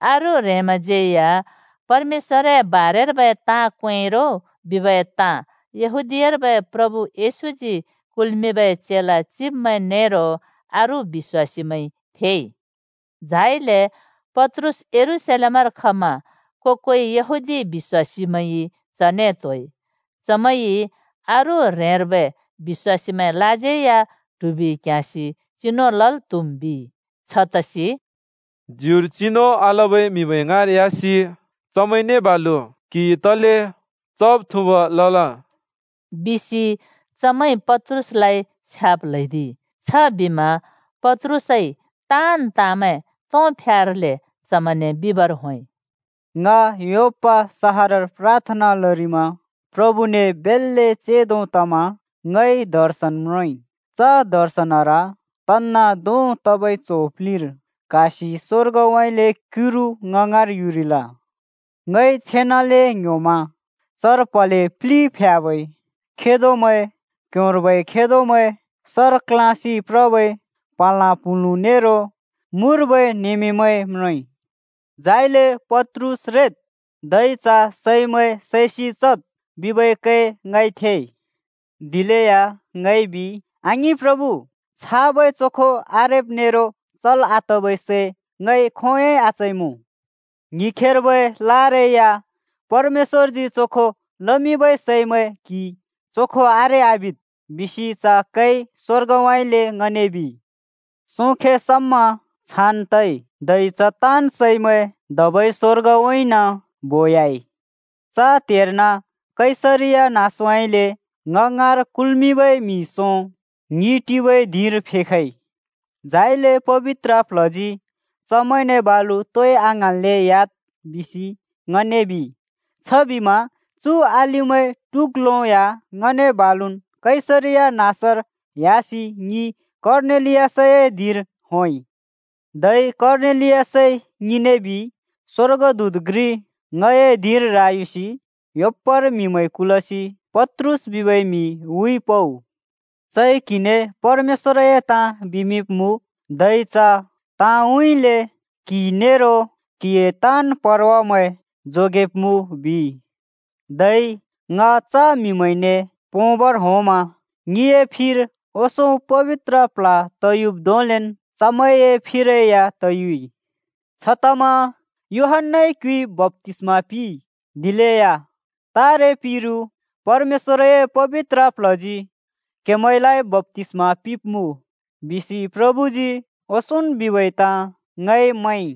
अरू ह्रेंमैंज्यै या परमेश्‍वरए ताँ क्वेंइ रो बिबै ताँ यहूदीयार्बै प्रभु येशूजी कुल्मिंबै चेला चिब्मैं नेरो अरू बिश्‍वासीमैंइ थेइ। झाइले पत्रुस यरूशलेमर खमा को-कोइ यहूदी बिश्‍वासीमैंइ चने त्होइ। चमैंइ “अरू ह्रेंर्बै बिश्‍वासीमैंलाज्यै या ट्हुबि क्ह्‍याँसि चिनु लल् त्हुम्” बिइ। छतसि “ज्युर चिनु आलबै म्हिमैं ङाँर ह्‍यासि चमैंने बालु क्हिइ तले चब्-थुँब लल!” बिसि चमैंइ पत्रुसलाइ छ्याब् ल्हैदिइ। छबिमा पत्रुसइ ताँन् ताँमैं तोंफ्यार्लै चमैंने बिबर होंइ: “ङ योप्पा सहरर प्राथना लरिमा प्रभुने बेल्‍ले चेंदो तमा ङइ दर्शन म्रोंइ। च दर्शनर तन्‍ना धों तबै च्हो प्लिर क्हासि स्वर्गउँइँले क्युरु ङ ङाँर युरिल। ङइ छेनाले ङ्‍ह्‍योमा चर प्हले प्लि प्ह्‍याबै खेदोमैं, क्ह्‍योंर्बै खेदोमैं, सर क्ल्याँसि प्रबै प्हँलाँ-प्हुँलुँ नेरो मुर्बै नमेमैं म्रोंइ। झाइले ‘पत्रुस रेद्, धै च सैमैं सैसि चद्,’ बिबै कै ङइ थेइ। दिलेया ङइ बिइ, ‘आङिं प्रभु! छाबै चोखो आरेब् नेरो चल् आतबै सै ङइ खोंयोंइ आचइमुँ।’ “ङ्हिखेबै लारै या, ‘परमेश्‍वरजी चोखो लमिंबै सैमैं क्हिइ चोखो आरे आबिद्!’ बिसि च कैइ स्वर्गउँइँले ङने बिइ। सोंखे समा छान् तइ, धै च ताँन् सैमैं धबै स्वर्गउँइँन बोयाइ। “च त्हेर्न कैसरिया नाँसउँइँले ङ ङाँर कुल्मिंबै म्हि सों ङि टिबै धिंर फेखइ। झाइले पबित्र प्ल्हजी, ‘चमैंने बालु तोइ आङ्हाँन्ले ह्‍याद्,’ बिसि ङने बिइ। छबिमा चु अलिमैं टुग्लो या ङने बालुन् कैसरिया नाँसर ह्‍यासि ङि कर्नेलियसए धिंर होंइ। धै कर्नेलियसइ ङिने बिइ, ‘स्वर्गदूत घ्रि ङए धिंर रायुसि, योप्पार म्हिमैं कुलसि पत्रुस बिबै म्हि हुइ पउ। चइ क्हिने परमेश्‍वरए ताँ बिमिंब्मुँ, धै च ताँउँइँले क्हि नेरो क्हिए ताँन् परवामैं जोगेब्मुँ,’ बिइ। “धै ङ च म्हिमैंने पोंबर होंमा ङिए फिर ओंसों पबित्र प्ल्ह तयुब् धोंलेन् चमैंए फिरै या तयुइ। छतमा ‘यूहन्‍नाइ क्युइ बप्‍तिस्मा पिंइ, दिलेया तारे पिरु परमेश्‍वरए पबित्र प्ल्हजी क्हेमैंलाइ बप्‍तिस्मा पिंब्मुँ,’ बिसि प्रभुजी ओंसोंन् बिबै ताँ ङइ मैंइ।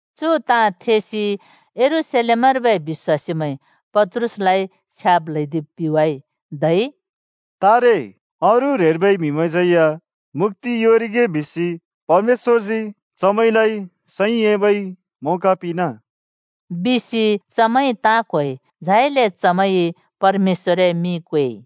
चु ताँ थेसि यरूशलेमर्बै बिश्‍वासीमैंइ पत्रुसलाइ छ्याब् ल्‍हैदिब् पिवाइ, धै “तारे अरू ह्रेंर्बै म्हिमैंज्यै या मुक्‍ति योंरिगे बिसि परमेश्‍वरजी चमैंलाइ सैं एबै मौका पिंना!” बिसि चमैंइ ताँ क्होइ। झाइले चमैंइ परमेश्‍वरए मिं क्वेइ।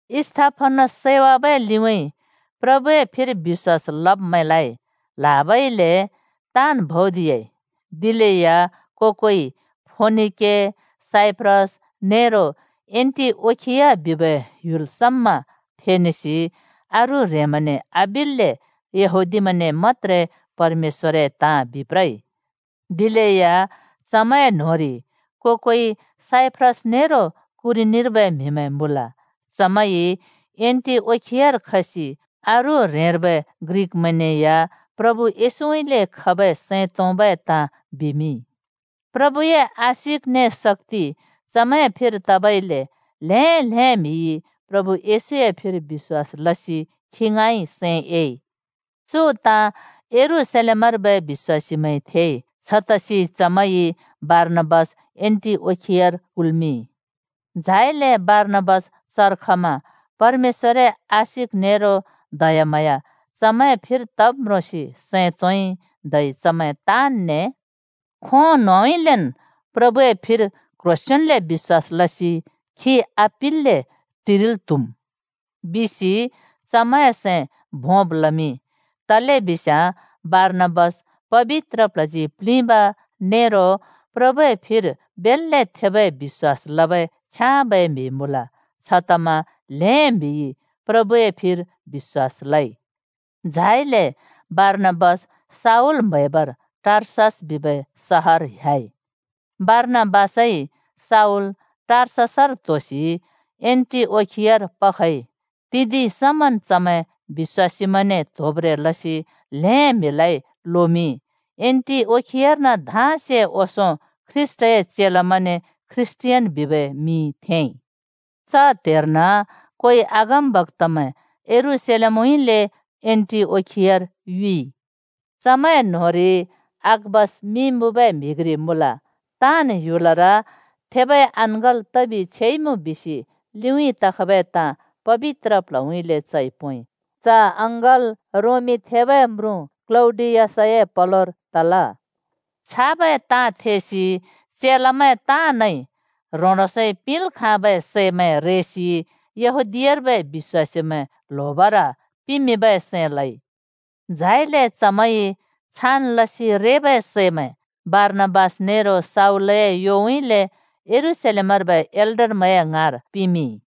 स्‍तिफनस सैवाबै लिउँइँ प्रभुए फिर बिश्‍वास लब्मैंलाइ ल्हाबइले ताँन् भौदियाइ। दिलेया को-कोइ फोनिके, साइप्रस नेरो एन्‍टिओखिया बिबै ह्‍युलमैं समा फेनेसि अरू ह्रेंमैंने आबिल्‍ले यहूदीमैंने मत्‍त्रे परमेश्‍वरए ताँ बिप्रइ। दिलेया चमैंए न्होंरि को-कोइ साइप्रस नेरो कुरेनीर्बै म्हिमैं मुँल। चमैंइ एन्‍टिओखियार खसि अरू ह्रेंर्बै ग्रिकमैंने या प्रभु येशूउँइँले खबै सैं तोंबै ताँ बिमिंइ। प्रभुए आशिक ने शक्‍ति चमैए फिर तबाइले ल्हें ल्हें म्हिइ प्रभु येशूए फिर बिश्‍वास लसि खी ङाँइ सैं एइ। चु ताँ यरूशलेमर्बै बिश्‍वासीमैंइ थेइ। छतसि चमैंइ बारनाबास एन्‍टिओखियार कुल्मिंइ। झाइले बारनाबास चर खमा परमेश्‍वरए आशिक नेरो दयाम्हाँया चमैंए फिर तब् म्रोंसि सैं तोंइ, धै चमैं ताँनने “खों न्होंउँइँलेन् प्रभुए फिर क्ह्रोंसेंन्ले बिश्‍वास लसि खी आपिल्‍ले टिरिल् त्हुम्,” बिसि चमैंए सैं भोंमिंइ। तलेबिस्याँ बारनाबास पबित्र प्ल्हजी प्लिंब नेरो प्रभुए फिर बेल्‍ले थेबै बिश्‍वास लबै छ्याँबै म्हि मुँल। छतमा ल्हें म्हिइ प्रभुए फिर बिश्‍वास लइ। झाइले बारनाबास शाऊल म्हैबर टार्सस बिबै सहर ह्‍याइ। बारनाबासइ शाऊल टार्ससर त्होसि एन्‍टिओखियार पखइ। तिदिं समन् चमैं बिश्‍वासीमैंने त्होब्‍ब्रें लसि ल्हें म्हिलाइ लोमिंइ। एन्‍टिओखियार्न धाँसे ओंसों ख्रीष्‍टए चेलामैंने ख्रीष्‍टियान बिबै मिं थेंइ। च त्हेर्न कोइ अगमबक्‍तामैं यरूशलेमउँइँले एन्‍टिओखियार युइ। चमैंए न्‍होंरि अगाबस मिं मुँबै म्हि घ्रि मुँल। ताँन् ह्‍युलर थेबै अँङ्गल् तबि छेइमुँ बिसि लिउँइँ तखबै ताँ पबित्र प्ल्हउँइँले चइ पोंइ। (च अँङ्गल् थेबै क्‍लौडियस म्रुँए पलोर तल।) छाबै ताँ थेसि चेलामैं ताँनइ ह्रों-ह्रोंसइ पिंल् खाँबै सैमैं रेसि यहूदीयार्बै बिश्‍वासीमैं ल्होबर पिमिंबै सैं लइ। झाइले चमैंइ छान् लसि रेबै सैमैं बारनाबास नेरो शाऊलए योउँइँले यरूशलेमर्बै एल्डरमैंए ङाँर चमैंइ पिमिंइ।